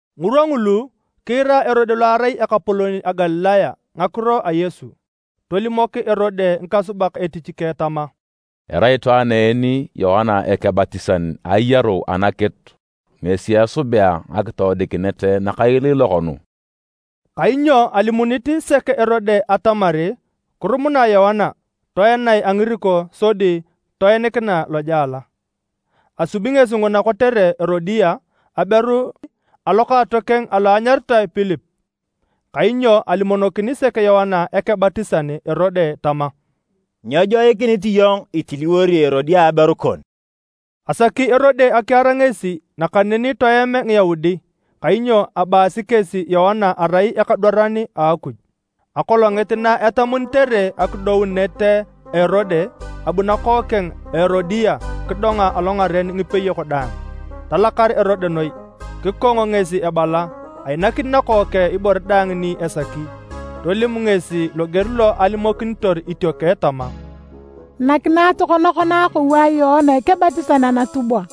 Ngirwa ngulu, kiira Erode lo arai ekapolon a Galilaya ngakiro a Yesu. Tolimok Erode ngikasubak etich keng tama, “Erai itwaan en Yoana Ekebatisan ayaru anakitu ngesi esubea ngakitoodikinet nakailiilok nu.” Kainyo alimunit sek Erode atamar kirumunae Yoana, toenae a ngiriko sodi toinikinae lojela. Asubi ngesi nguna kotere Erodia, aberu a lokaatokeng alo anyaritae Pilip. Kainyo alimonokini sek Yoana Ekebatisan Erode tama, “Nyejoikinit iyong itiliwori Erodia aberu kon.” Asaki Erode akiar ngesi nakaneni toem Ngiyaudi kainyo abaasi kesi Yoana erai ekadwaran a Akuj. Akolongit na etamunitere akidounet a Erode, abu nakookeng a Erodia kidonga alongaren ngipeyok daang. Talakar Erode noi. Kikong ngesi ebala ainakini nakookeng ibore daang ni esaki. Tolim ngesi loger lo alimokinitor itiokeng tama, “Nakinae tokona kona akou a Yoana Ekebatisan anatubwa!”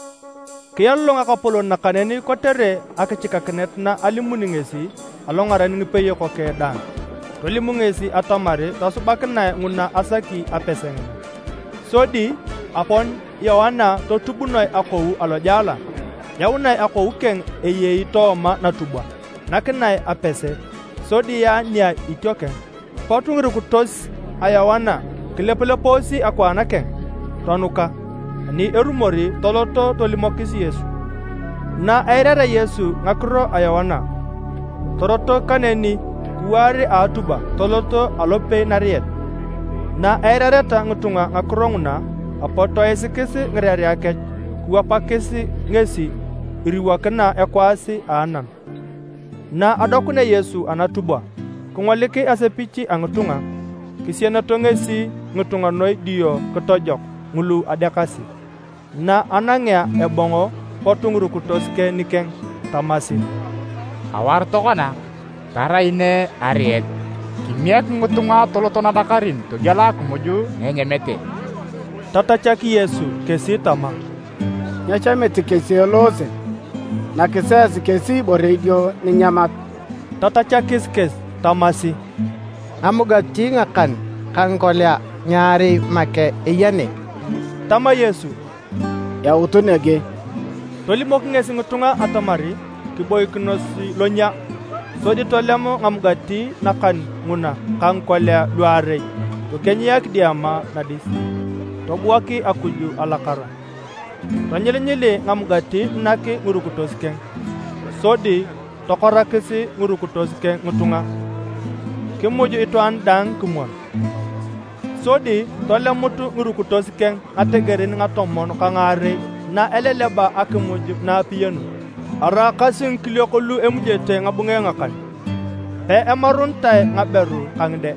Kialolong ekapolon, nakaneni kotere akichikakinet na alimuni ngesi alongaren ngipeyok keng daang, tolim ngesi atamar tosubakinae nguna asaki apese ngina. Sodi apon Yoana totubunoe akou alojela. Yaunae akou keng eyei tooma natubwa nakinae apese, sodi yaa nia itiokeng. Pot ngirukitos a Yoana kilepulepoosi akwaan keng, tonuka, ani erumor toloto tolimokis Yesu. Na eirarea Yesu ngakiro a Yoana, torotok kaneni kiwaar a atubwa tolot alopei nariet. Na eirareta ngitunga ngakiro nguna, apot toisikis ngirerea kech kiwapakis ngesi iriwokina ekwaas a anam. Na adokunea Yesu anatubwa, kingolik asepich a ngitunga. Kisieneto ngesi ngitunga noi dio kitojok ngulu adeakasi. Na anangea ebong, pot ngirukitos keng nikeng tamasi, “Awar tokona, tarai ne ariet. Kimiek ngitunga toloto nadakarin togiela akimuj na enyamete.” Tatachak Yesu kesi tama, “Nyechamit kesi eloose, nakisi esi kesi ibore idio ninyamat!” Tatachakis kesi tamasi, “Ngamugati ngakan ka ngikolia ngiarei make eya ne.” Tama Yesu, “Yautu nege.” Tolimok ngesi ngitunga atamar kiboikinos lonyia. Sodi tolem ngamugati nakan nguna ka ngikolia luarei tokienyia kidiama nadis, tobuak Akuj alakara. Tonyilinyili ngamugati nak ngirukitos keng, sodi tokorakis ngirukitos keng ngitunga. Kimuj itwaan daang kimwon. Sodi tolemut ngirukitos keng ngategerin ngatomon ka ngaarei na eleleba akimuj na apiyanun. Araakasi ngikiliok lu emujete ngabunge ngakan, peimarunitae ngaberu ka ngide.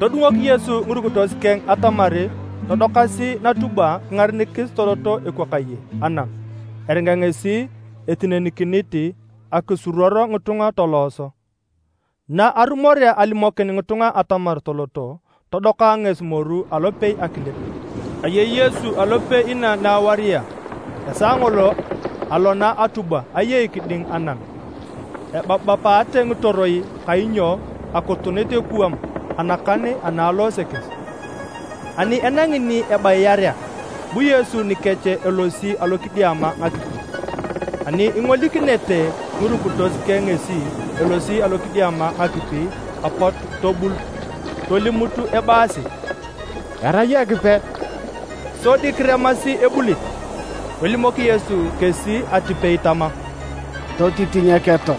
Todungok Yesu ngirukitos keng atamar todokasi natubwa kingarenikis toloto ekwakaye anam eringa ngesi etinenikinit akisuruor ngitunga tolooso. Na arumorea alimokin ngitunga atamar toloto, todoka ngesi moru alopei akilip. Ayei Yesu alopei inaa na awaria. Esaa ngolo alona atubwa ayei kiding anam ebapabapate ngitoroi kainyo akutunit ekuwam anakan ana aloose kesi. Ani enangi ni ebayiarea bu Yesu nikech elosi alokidiama ngakipi. Ani ingolikinete ngirukitos keng ngesi elosi alokidiama ngakipi apot tobul, tolimut ebaasi, “Erai Ekipe,” sodi kiremasi ebulit. Tolimok Yesu kesi atipei tama, “Totitinyeketo.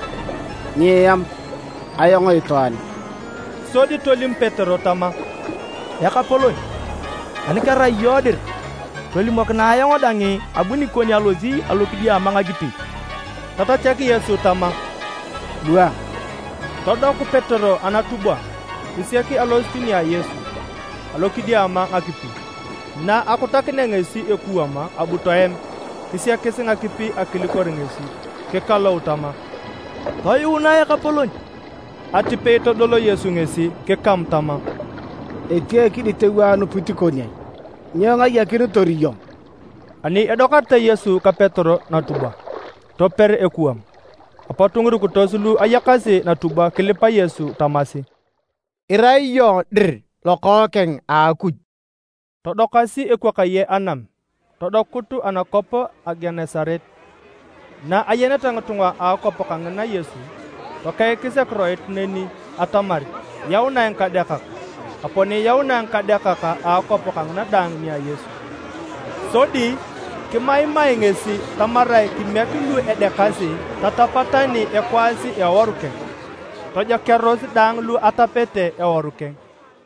Nyieam, ayong itwaan.” Sodi tolim Petero tama, “Ekapolon, ani kerai iyong dir, tolimokinae ayong dang abu nikon alosi alokidiama ngakipi.” Tatachak Yesu tama, “Bua!” Todoku Petero anatubwa kisiak alosit nia Yesu alokidiama ngakipi. Na akutakinea ngesi ekuwam abu toem kisiakis ngakipi akilikor ngesi. Kikalou tama, “Toyuunae Ekapolon.” Atipei todol Yesu ngesi kikamu tama, “Etia ekiditeu a anupit kon ai? Nyo ingayakinitor iyong?” Ani edokarete Yesu ka Petero natubwa, toper ekuwam. Apot ngirukitos lu ayakasi natubwa kilipa Yesu tamasi, “Irai iyong dir Lokookeng a Akuj.” Todokasi ekwakaye anam todokut anakwap a Genesaret. Na ayeneta ngitunga a akwap kangina Yesu, tokeikis akiroit neni atamar yaunae ngikadeakak. Apon yaunae ngikadeakak a akwap kangina daang nia Yesu. Sodi kimaimae ngesi tamarae kimiek lu adeakasi tatapa tani ekwaas a eworu keng. Tojokearos daang lu atapete eworu keng.